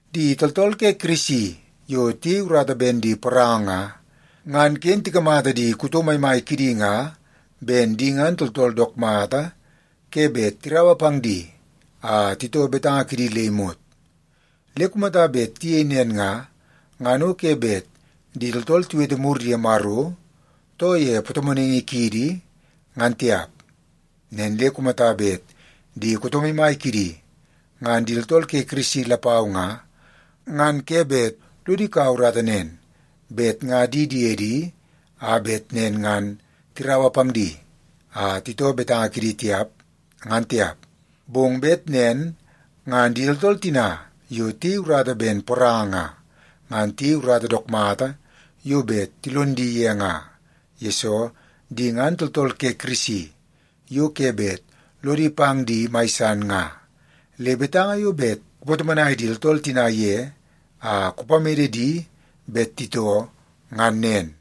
Di tooltool ke Kirisi yo tiyei urata ben di poranga nga, ngan ken tikamata di kuto maimai kidi nga ben di ngan tooltool dook mata ke bet tiraua pang di a titoo betanga kidi le imot. Le kumata bet tiyei nen nga, ngan o ke bet di tooltool tiwete mur ye Maro, too ye patomonaingi kiidi, ngan tiap. Nen le kumata bet di kuto maimai kidi ngan di tooltool ke Kirisi lapau nga, ngan ke bet lodi kau urata nen bet nga di diedi a bet nen ngan tiraua pang di a titoo betanga kidi tiap, ngan tiap. Bong bet nen ngan di tooltool tina yo tiyei urata ben poranga nga, ngan tiyei urata dook mata yo bet tilon di ye nga, yesoo di ngan tooltool ke Kirisi yo ke bet lodi pang di mai san nga. Le betanga yo bet kupatomonai di tooltool tina ye a kupamede di bet titoo, ngan nen.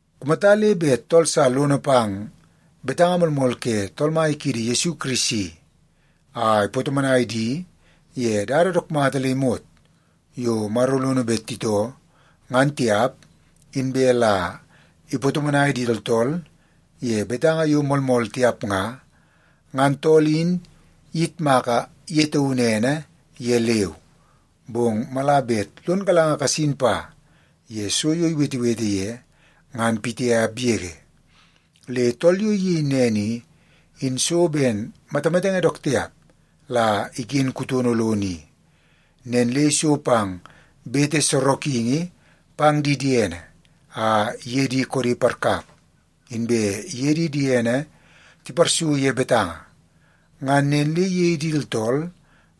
Kumata le bet tool sa lono pang betanga moolmool ke Tool Mai kiidi Yesu Kirisi a ipatomonai di ye dada dook mata le imot yo Maro lono bet titoo, ngan tiap, inbe la ipatomonai di tooltool ye betanga yo moolmool tiap nga, ngan tool in iyitmaka ye taunu ene ye leu, bong mala bet lon galanga kasin pa ye so yo iwetewete ye, ngan pitiap yege. Le tool yo iyei nen i, in so ben matamatenge dook tiap la iken kutono lono i. Nen le iso pang bete sorokingi pang di diene a iye di koodi parkap, inbe iye di diene tiparsu ye betanga. Ngan nen le iyei di tooltool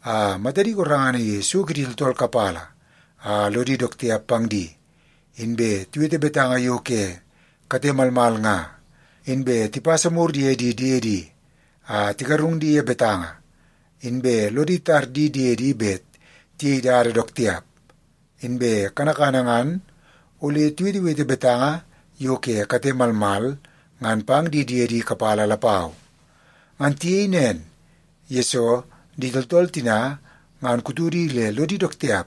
a matadi gorengana ye so kidi tooltool kapala a lodi dook tiap pang di, inbe tiwete betanga yo ke kate malmal nga, inbe tipasa mur ye di diedi a tigarung di ye betanga, inbe lodi tar di diedi bet tiyei dada dook tiap, inbe kanakana ngan ole tiwetewete betanga yo ke kate malmal ngan pang di diedi kapala lapau. Ngan tiyei nen, yesoo di tooltool tina ngan kutodi le lodi dook tiap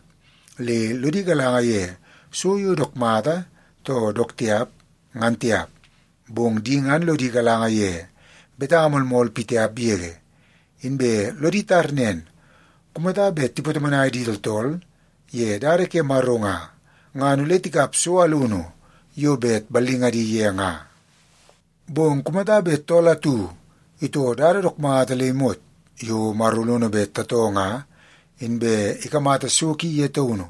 le lodi galanga ye so yo dook mata too dook tiap, ngan tiap. Bong di ngan lodi galanga ye betanga moolmool pitiap yege. Inbe lodi tar nen, kumata bet tipatomonai di tooltool ye dada ke Maro nga, ngan ole tikap so alunu yo bet ballingadi ye nga. Bong kumata bet tool atu itoo dada dook mata le imot yo Maro lono bet tatoo nga, inbe ikamata so ki ye taunu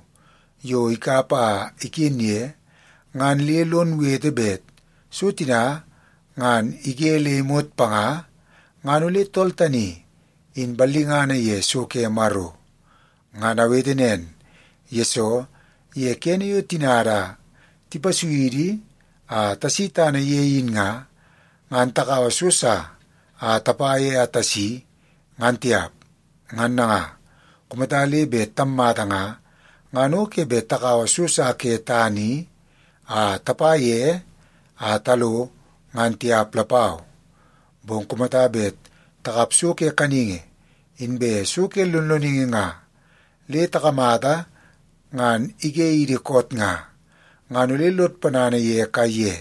yo ikap a iken ye, ngan le lon wete bet so tina ngan ige le imot panga nga, ngan ole tool tani in ballingana ye so ke Maro. Ngan awete nen, yesoo ye kene yo tinada tipasui idi a tasi tana ye in nga, ngan takaua so sa a tapa ye a tasi, ngan tiap. Ngan nanga, kumata le bet tammata nga, ngan o ke bet takaua so sa ke tana i a tapa ye a talo ngan tiap lapau. Bong kumata bet takap so ke kaningi inbe so ke lonloningi nga le takamata ngan ige idi koot nga, ngan ole lod ponana ye kaiye.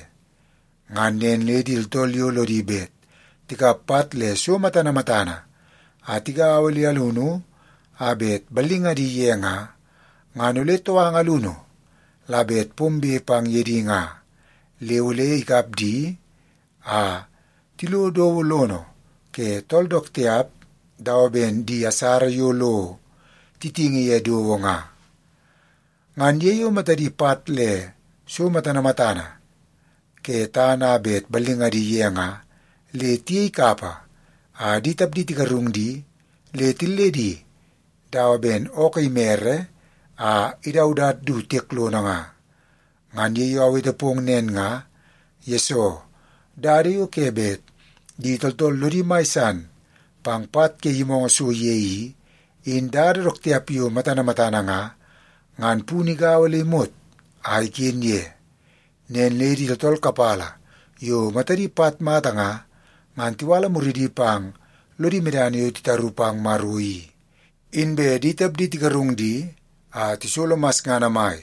Ngan nen le di tooltool yo lodi bet tikap pat le so matana matana a tigaua le alunu a bet ballingadi ye nga, ngan ole touanga alunu la bet pombe pang ye di nga, le ole ikap di a tilo dowo lono ke tool dook tiap dawa ben di asara yo lo titingi ye dowo nga. Ngan ye yo matadi pat le so matana matana ke tana a bet ballingadi ye nga, le tiyei kapa a di tapdi tigarung di le tilledi dawa ben ookoo imere a idaudat du tiek lono nga. Ngan ye yo awete pong nen nga, yesoo dada yo ke bet di tooltool lodi mai san pang pat ke yimoongoo so ye i, in dada dook tiap yo matana matana nga, ngan punu igaua le imot a iken ye. Nen le di tooltool kapala yo matadi pat mata nga, ngan tiwala muridi pang lodi medana yo titaru pang Maro i, inbe di tapdi tigarung di a tisolo masngana mai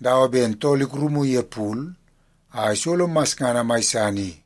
dawa ben tool ikurumu ye pul a isolo masngana mai san i.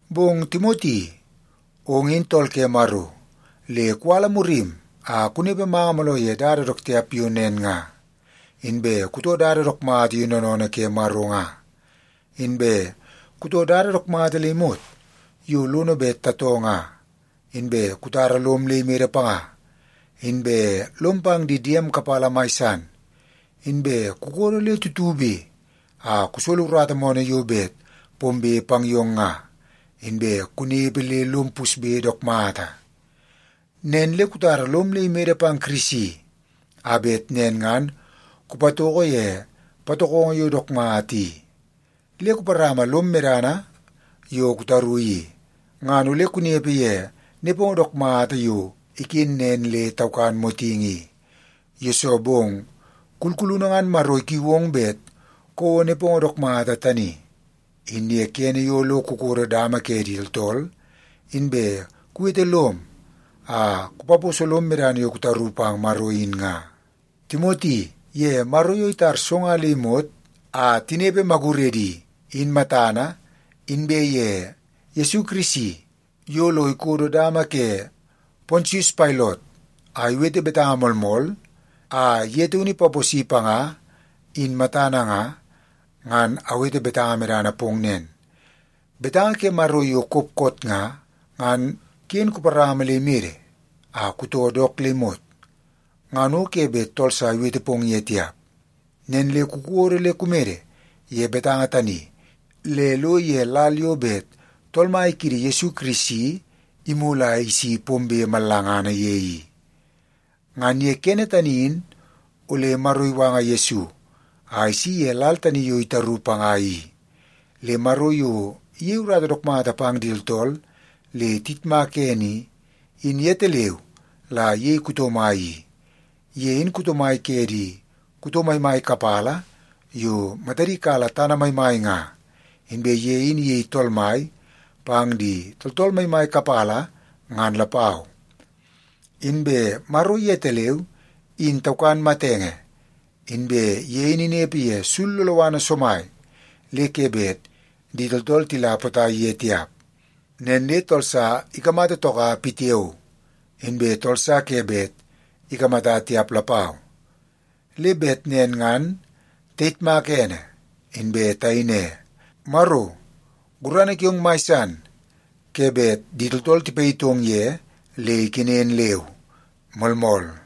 Bong Timoti, ong in tool ke Maro, le kuwala murim a kunepe manga mooloo ye dada dook tiap yo nen nga. Inbe kutoo dada dook mata yo noonoonoo ke Maro nga, inbe kutoo dada dook mata le imot yo lono bet tatoo nga, inbe kutara lom le imede panga, inbe lom pang di diem kapala mai san, inbe kukodo le tutube a kusolo urata moonoo yo bet pombe pang yong nga, inbe kunepe le lom pusbe dook mata. Nen le kutara lom le imede pang Kirisi a bet nen ngan kupatoko ye patokongo yo dook mata i. Le kuparama lom medana yo kutaru i, ngan ole kunepe ye nepongo dook mata yo iken nen le taukan motingi i. Yesoo bong, kulkulunu ngan Maro ikiu ong bet kouo nepongo dook mata tani, in ye kene yo lo kukodo dama ke di tooltool, inbe kuwete lom a kupaposo lom medana yo kutaru pang Maro in nga. Timoti, ye Maro yo itar so nga le imot a tinepe maguredi, in matana, inbe ye Yesu Kirisi yo lo ikodo dama ke Pontius Pailot a iwete betanga moolmool a ye taunu ipaposi panga, in matana nga, ngan awete betanga medana pong nen, betanga ke Maro yo kop koot nga, ngan ken kuparama le imede a kutoo dook le imot, ngan o ke bet tool sa iwete pong ye tiap. Nen le kukodo le kumede ye betanga tani le lo ye lal yo bet Tool Mai kiidi Yesu Kirisi imulu a isi pombe mallangana ye i. Ngan ye kene tani in ole Maro iwanga Yesu a isi ye lal tani yo itaru panga i. Le Maro yo iyei urata dook mata pang di tooltool le tiyitmak ene i, in yetaleu la iyei kuto mai i. Ye in kuto mai ke di kuto maimai kapala yo matadi kala tana maimai nga. Inbe ye in iyei Tool Mai pang di tooltool maimai kapala, ngan lapau. Inbe Maro yetaleu, in taukan matenge, inbe ye in inepe ye sul loloana somai le ke bet di tooltool tila potai ye tiap. Nen le tool sa ikamata toka pitiao, inbe tool sa ke bet ikamata tiap lapau. Le bet nen ngan tayitmaka ene inbe tayei ne, “Maro, gurana kiong mai san ke bet di tooltool tipayitong ye le ikenen leu.” Moolmool.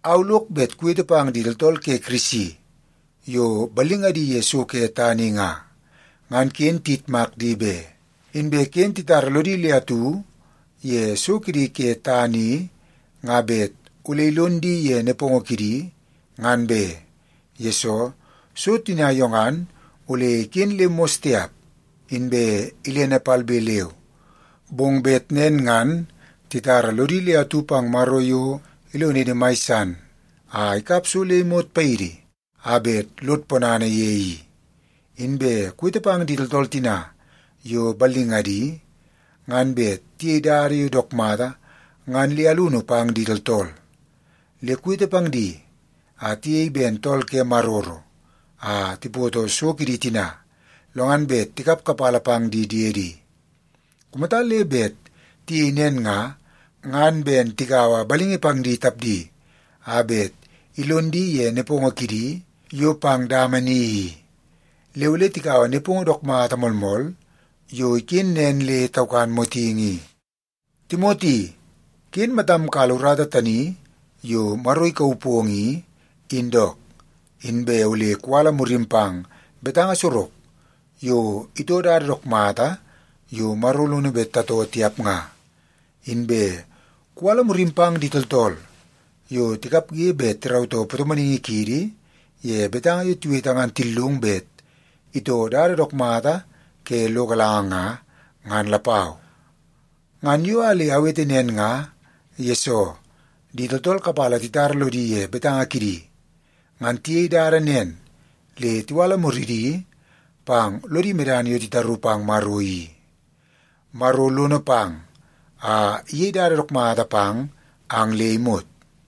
Au lok bet kuwete pang di tooltool ke Kirisi yo ballingadi ye so ke tana i nga, ngan ken tiyitmak di be. Inbe ken titara lodi le atu ye so kidi ke tana i nga bet ole ilon di ye nepongo kidi, ngan be. Yesoo, so tina yo ngan ole iken le mos tiap, inbe ilene palbe leu. Bong bet nen ngan titara lodi le atu pang Maro yo ilonidi mai san a ikap so le imot paidi a bet lod ponana ye i. Inbe kuwete pang di tooltool tina yo ballingadi ngan bet tiyei dada yo dook mata ngan le alunu pang di tooltool. Le kuwete pang di a tiyei ben tool ke maroro a tipoto so kidi tina, lo ngan bet tikap kapala pang di diedi. Kumata le bet tiyei nen nga, ngan ben tigaua balingi pang di tapdi a bet ilon di ye nepongo kidi yo pang dama ni i. Le ole tikaua nepongo dook mata moolmool yo iken nen le taukan motingi i. Timoti, ken matam kala urata tani yo Maro ikauu pong i, in dook. Inbe ole kuwala murim pang betanga sorok yo itoo dada dook mata yo Maro lono bet tatoo tiap nga. Inbe kuwala murim pang di tooltool yo tikapge bet tirautoo patomonaingi kiidi ye betanga yo tiwete ngan tillung bet itoo dada dook mata ke lo galanga nga, ngan lapau. Ngan yo a le awete nen nga, yesoo di tooltool kapala titara lodi ye betanga kidi. Ngan tiyei dada nen le tiwala muridi pang lodi medana yo titaru pang Maro i. Maro lono pang a iyei dada dook mata pang ang le imot.